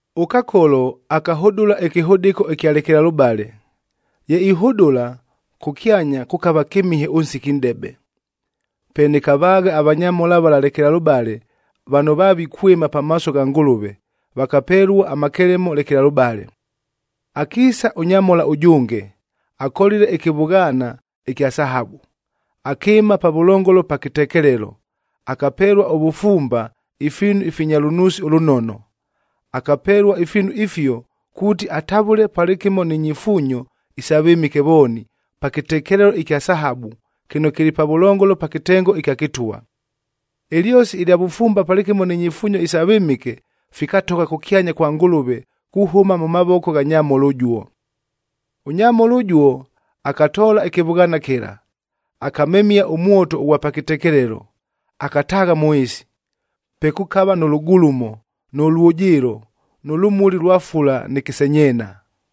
ɄKakolo akahʉdʉla ɨkɨhʉdɨko ɨkya lekelalʉbale. Ye ihʉdʉla, kʉkyanya kʉkava kɨmihe ʉnsiki nʼdebe. Pe nɨkavaagha avanyamhola vala lekelalʉbale vano vavikwɨma pamaaso gha Ngʉlʉve, vakapelua amakelemo lekelalʉbale. Akiisa ʉnyamhola ʉjʉnge, akolile ɨkɨvʉghaana ɨkya sahabu. Akɨɨma pavʉlongolo pa kɨtekelelo, akapelua ʉvʉfumba ifiinu ifinya lʉnuusi ʉlʉnono. Akapelua ifiinu ifio kuuti atavʉle palɨkɨmo ni nyifuunyo isa vɨmɨke vooni, pa kɨtekelelo ɨkya sahabu, kɨno kɨlɨ pavʉlongolo pa kɨtengo ɨkya kɨtwa. Ɨlyosi ɨlya vʉfumba palɨkɨmo ni nyifuunyo isa vɨmɨke, fikatogha kʉkyanya kwa Ngʉlʉve kuhʉma mʉ mavoko gha nyamhola ʉjuo. Ʉnyamhola ʉjuo akatoola ɨkɨvʉghaana kɨla, akamemia ʉmwoto ʉghwa pa kɨtekelelo, akataagha mʉ ɨɨsi, pe kʉkava nʉ lʉgulumo, nʉ lwʉjɨɨlo, nʉ lʉmuli lwa fula nɨ kɨsenyeena.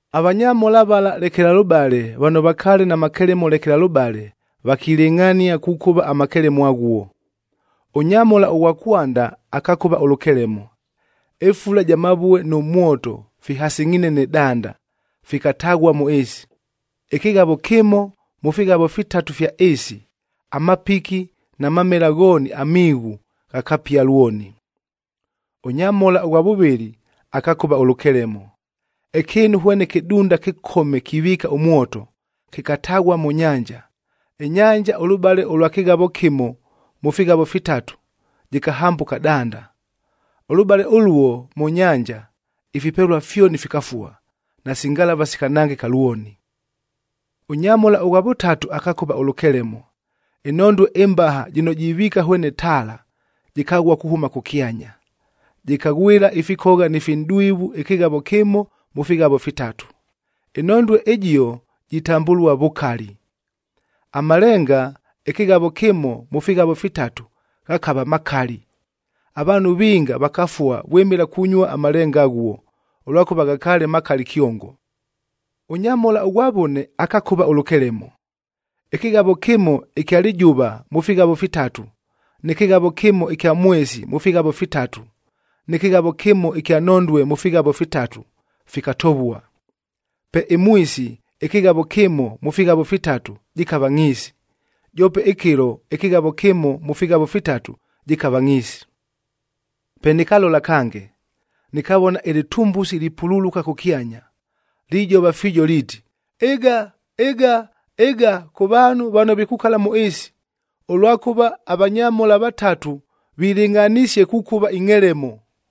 Avanyamhola vala lekelalʉbale vano vakaale na makelemo lekelalʉbale, vakilɨngʼhania kukʉva amakelemo aghuo. Ʉnyamhola ʉghwa kwanda akakʉva ʉlʉkelemo. Ɨfula ja mavue nʉ mwoto fihasɨngʼhiine nɨ danda, fikataghua mʉ ɨɨsi. Ɨkɨghavo kɨmo, mʉ fighavo fitatu ifya ɨɨsi, amapiki na mamela ghooni amiighu ghakapia lwoni. Ʉnyamhola ʉghwa vʉvɨlɨ akakʉva ʉlʉkelemo. Ɨkɨɨnu hwene kɨdunda kɨkome kiviika ʉmwoto, kɨkataghua mʉ nyanja. Ɨnyanja ʉlʉbale ʉlwa kɨghavo kɨmo mʉ fighavo fitatu jɨkahambʉka danda. Ʉlʉbale ʉluo mʉ nyanja, ifipelua fyoni fikafua, nasi ngalavaa sikanangɨka lwoni. Ʉnyamhola ʉghwa vʉtatu akakʉva ʉlʉkelemo. Ɨnhondue ɨmbaha jɨno jiviika hwene taala, jɨkaghua kuhʉma kʉkyanya. Jɨkaghwɨla ifikogha ni finʼdwivu ɨkɨghavo kɨmo mʉ fighavo fitatu. Ɨnhondue ɨjio jitambʉlua Vʉkali. Amalenga ɨkɨghavo kɨmo mʉ fighavo fitatu ghakava makali, avaanhu vinga vakafua vwɨmɨla kunyua amalenga aghuo, ʉlwakʉva ghakaale makali kyongo. Ʉnyamhola ʉghwa vʉne akakʉva ʉlʉkelemo. Ɨkɨghavo kɨmo ɨkya lɨjʉva mʉ fighavo fitatu, nɨ kɨghavo kɨmo ɨkya mwesi mʉ fighavo fitatu, nɨ kɨghavo kɨmo ɨkya nhondue mʉ fighavo fitatu, fikatovua. Pe ɨmwisi ɨkɨghavo kɨmo mʉ fighavo fitatu jɨkava ngʼhiisi, joope ɨkɨlo ɨkɨghavo kɨmo mʉ fighavo fitatu jɨkava ngʼhiisi. Pe nɨkalola kange, nɨkavona ɨlɨtumbusi lipululuka kʉkyanya, lijova fiijo liiti, “Ɨga! Ɨga! Ɨga kʉ vaanhu vano vikukala mʉ ɨɨsi, ʉlwakʉva avanyamhola vatatu vilɨngʼhanisie kukʉva ingʼhelemo.”